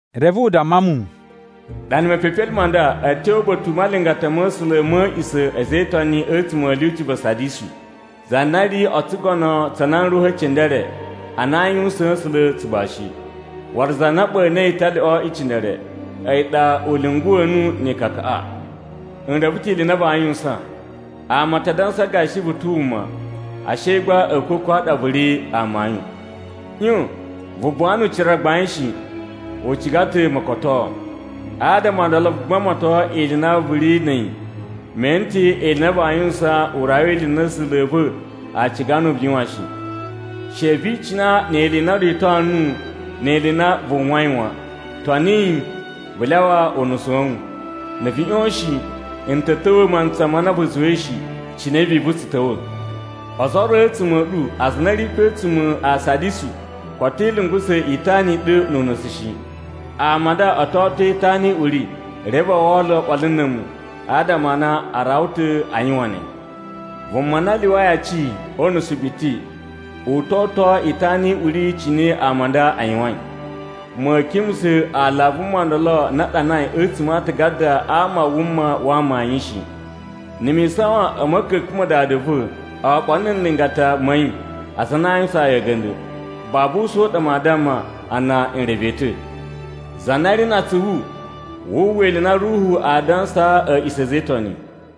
Reve u damma mu, “Ɗana mepepelime ma nda a̱ tyo uba̱ta̱ u malingata ma̱ A̱sula̱ ma̱ a̱a̱ꞌisa̱ a̱ a̱za̱ e Itoni a̱tsuma̱ a̱ lyuci va Sadisu. Za na ri o tsugono tsa nan ruhu e cindere a na aa yuwusaan A̱sula̱ tsugbashi, waru za na ɓa̱na̱i italyoꞌo i cindere, a̱yi ɗa u lyunguwa̱ nuwu ni ikakaꞌa: n reve ta̱ ili i na vaa yuwusan. Ama a ta dansa gashi vu ta̱ wuma, ashe gba a̱a̱kwa̱kwa̱ a ɗa vu ri amayun. ꞌYon! Vu buwa nu ucira gbain shi, u ciga ta̱ mokotoo. Adama o ndolo vu gbamato ili i na vu ri na̱ a̱yi. Me ene ta̱ ili i na vaa yuwusan u rawa ili i na A̱sula̱ a̱ va̱ a ciga nuwu vu yuwan shi. She vi icina ni ili i na o rito nuwu, ni ili i na vu uwwai wan. Toni yi, vu lyawa unusu wa̱ wu. Na̱ vu ꞌyon shi, n ta̱ ta̱wa̱ mantsa ma na vu zuwai shi, cine vivu tsu ta̱wa̱. Ozo o ro a̱tsuma̱ a̱ ɗu aza a na a̱ ri pe a̱tsuma̱ a Sadisu koto i lungusa̱ itana i ɗu nu unusu shi. Ama a nda o to oto itana i uri reve a wala oɓolo na̱ a̱mu adama a na a rawa ta̱ a yuwan ne. Vuma na lyuwai aci o unusu biti, u to oto itana i uri cine ama a nda a yuwain. Ma̱a̱ kimusa̱ aala a vuma ndolo na a ɗanai a̱tsuma̱ a aatagada a ama a wuma wa amayun shi. Na̱ mi isawan a̱ ma̱ka̱ka̱n ma Dada va̱ oɓolo na̱ nlingata ma̱ yi aza a na a yuwusaan yi a̱ga̱nda̱, babu usa̱n u ɗa maa damma a na n reve yi ta̱. “Za na ri na atsuvu, wu uwwa ili i na Ruhu aa dansaa a̱ꞌisa̱ a̱ a̱za̱ e Itoni!”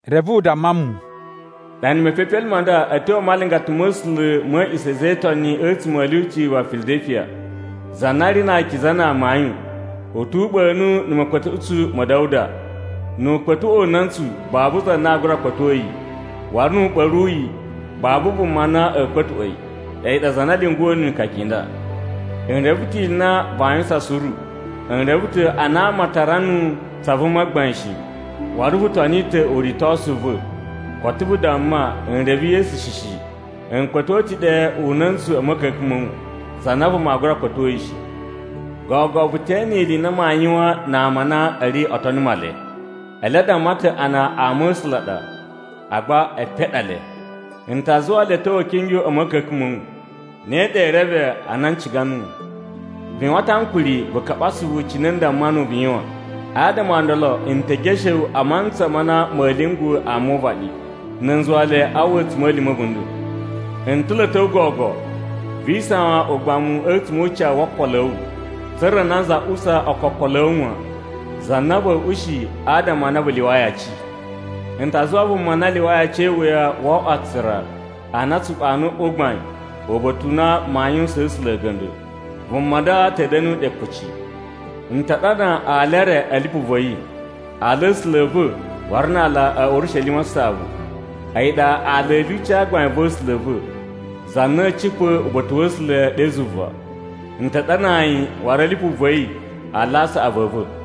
Reve u damma mu, “Ɗana mepepelime ma nda a̱ tyo a malingata ma̱ A̱sula̱ ma̱ a̱a̱ꞌisa̱ a̱ a̱za̱ e Itoni a̱tsuma̱ a̱ lyuci va Filadalifiya. Za na ri na akiza na amayun u tu uɓa̱nu na̱ ma̱kpa̱tuꞌutsu ma̱ Da̱wuda. Nu u kpa̱tuꞌwa̱ una̱ntsu babu za na aa gura kpa̱to yi. Waru nu u ɓa̱ru yi, babu vuma na a̱a̱ kpa̱tuꞌwa̱ yi. A̱yi ɗa za na lyunguwa̱ nuwu ni ikaka i nda: N reve ta̱ ili i na vaa yuwusan suru. N reve ta̱ a na ama a tara nuwu tsa vuma gbain shi. Waru vu toni ta̱ uritosu u va̱, koto vu damma, ‘N reve Yesu shi shi.’ M kpa̱tuꞌwa̱ ta̱ ɗe una̱ntsu a̱ ma̱ka̱ka̱n ma̱ wu, za na vuma aa gura kpa̱to yi shi. Gogo vu te ene ili i na maa yuwan na ama a na a̱ ri o tono Male. Ele a damma ta̱ a na ama a̱ A̱sula̱ a ɗa, agba epen a ɗa le. N ta zuwa le a̱ ta̱wa̱ a̱ kingyo a̱ ma̱ka̱ka̱n ma̱ wu. Ne ɗa ee reve a na n ciga nuwu. Vu yuwan ta̱ ankuri vu kaɓa asuvu cine n damma nuwu vu yuwan. Adama o ndolo, n te geshe wu a mantsa ma na ma̱a̱ lyungwa̱ ama o uvaɗi, na̱ n zuwa le a uwwa a̱tsuma̱lima̱ a̱ a̱bunda̱. N ta̱ lo a̱ ta̱wa̱ gogo. Vi isawan ugbamu a̱tsuma̱ o ucawu wo okolo a̱ wu, tsa̱ra̱ nanza usa ookokolo a̱ wu wan, za na va̱a̱ ushi adama a na vu lyuwai aci. N ta zuwa vuma na lyuwai aci e iwuya wo oꞌwo aatsura a na a̱ tsu ɓa̱na̱ uꞌwa u gbain uba̱ta̱ u na maa yuwusaan A̱sula̱ a̱ga̱nda̱. Vuma nda ta̱ da̱na̱ ɗe kuci. N ta ɗana ala e re a̱ lipu va̱ yi, aala a̱ A̱sula̱ a̱ va̱, waru na aala a̱ Urishelima Saꞌavu, a̱yi ɗa aala a̱ lyuci gbain va̱ A̱sula̱ a̱ va̱, za na a̱a̱ cipa̱ uba̱ta̱ wa̱ A̱sula̱ ɗe zuva. N ta ɗanaa yi waru a̱ lipu va̱ yi aala a saꞌavu a̱ va̱.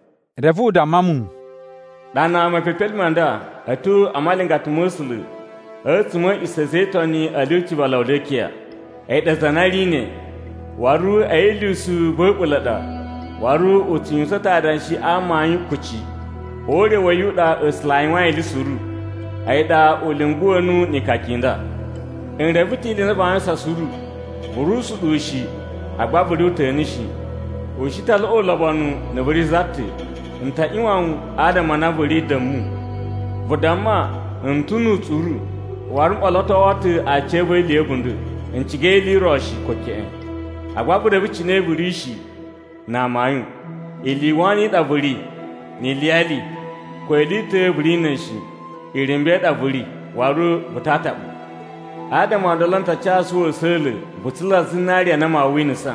Reve u damma mu, “Ɗana mepepelime ma nda a̱ tyo a malingata ma̱ A̱sula̱ a̱tsuma̱ a̱ a̱a̱ꞌisa̱ a̱ a̱za̱ e Itoni a̱ lyuci va Lawudikiya. A̱yi ɗa Za na Ri Ne. Waru a̱yi lyusu va̱ a̱ɓula̱ ɗa waru u tsu yuwusan ta̱ adanshi a amayun kuci. O ure wa̱ yi u ɗa A̱sula̱ a yuwain ili suru. A̱yi ɗa u lyunguwa̱ nuwu ni ikaka i nda: N reve ta̱ ili i na vaa yuwusan suru, vu ri usuɗuwu shi, agba vu ri uta̱nu shi. U shi ta laꞌa ulobonu na̱ vu ri za ta̱. N ta ꞌyuwan wu adama a na vu ri da̱mu. Vu damma, ‘N ta̱ nu utsuru, waru m ɓolotowo ta̱ aciya̱va̱ ili ya̱ a̱bunda̱. N ciga ili i ro shi, ko keꞌen.’ Agba vu reve cine vu ri shi na amayun: ili i wono i ɗa vu ri, ni iliyali, ko ili i ta̱ vu ri na̱ a̱yi shi, irumba̱ i ɗa vu ri, waru vu ta ataɓu. Adama o ndolo, n ta casu wu a̱sa̱la̱ vu tsula zinariya na maa winasa.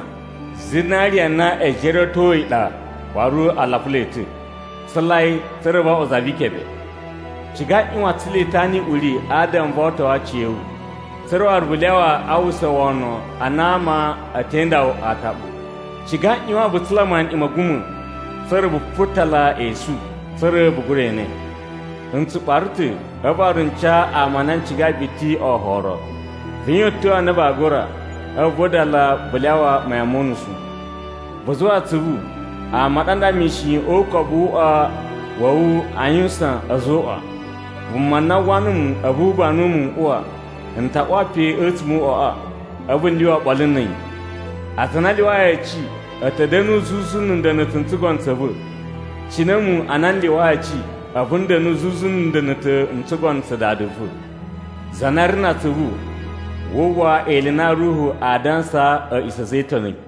Zinariya na e jeruwetoi ɗa waru a lapula yi ta̱. Tsula yi tsa̱ra̱ vo oꞌwo za vi ikebe. Ciga ꞌyuwan tsula itana i uri adama vo otoo aciya̱wu, tsa̱ra̱ waru vu lyawa a uwwusa wono a na ama a̱ te inda wu ataɓu. Ciga ꞌyuwan vu tsula maniꞌin ma̱ a̱guma̱ tsa̱ra̱ vu putala e esu, tsa̱ra̱ vu gura ene. “N tsu ɓara ta̱ a̱vu waru n ca ama a na n cigai biti oforo. Vu yuwan a̱tyo a na vaa gura, a̱vu vu vadala vu lyawa mayan mo unusu. Vu zuwa atsuvu, a̱mu ɗa nda mishin o ukobu wu uꞌwa wa̱ wu a yuwusan, ‘A̱zoꞌwa!’ Vuma na uwwa numu a̱vu u banu mu n uwa, n ta uwa pe a̱tsuma̱ o uꞌwaꞌa a̱vu n lyuwa oɓolo na̱ a̱yi. “Aza a na a lyuwai aci, a̱ ta̱ da̱nu zuzu na̱ nda̱na̱ta̱ n tsugono tsa̱ va̱, cine a̱mu ana n lyuwai aci, a̱vu n da̱nu zuzu na̱ nda̱na̱ta̱ n tsugono tsa Dada va̱. “Za na ri na atsuvu, wu uwwa ili i na Ruhu aa dansaa a̱ꞌisa̱ a̱ a̱za̱ e Itoni!”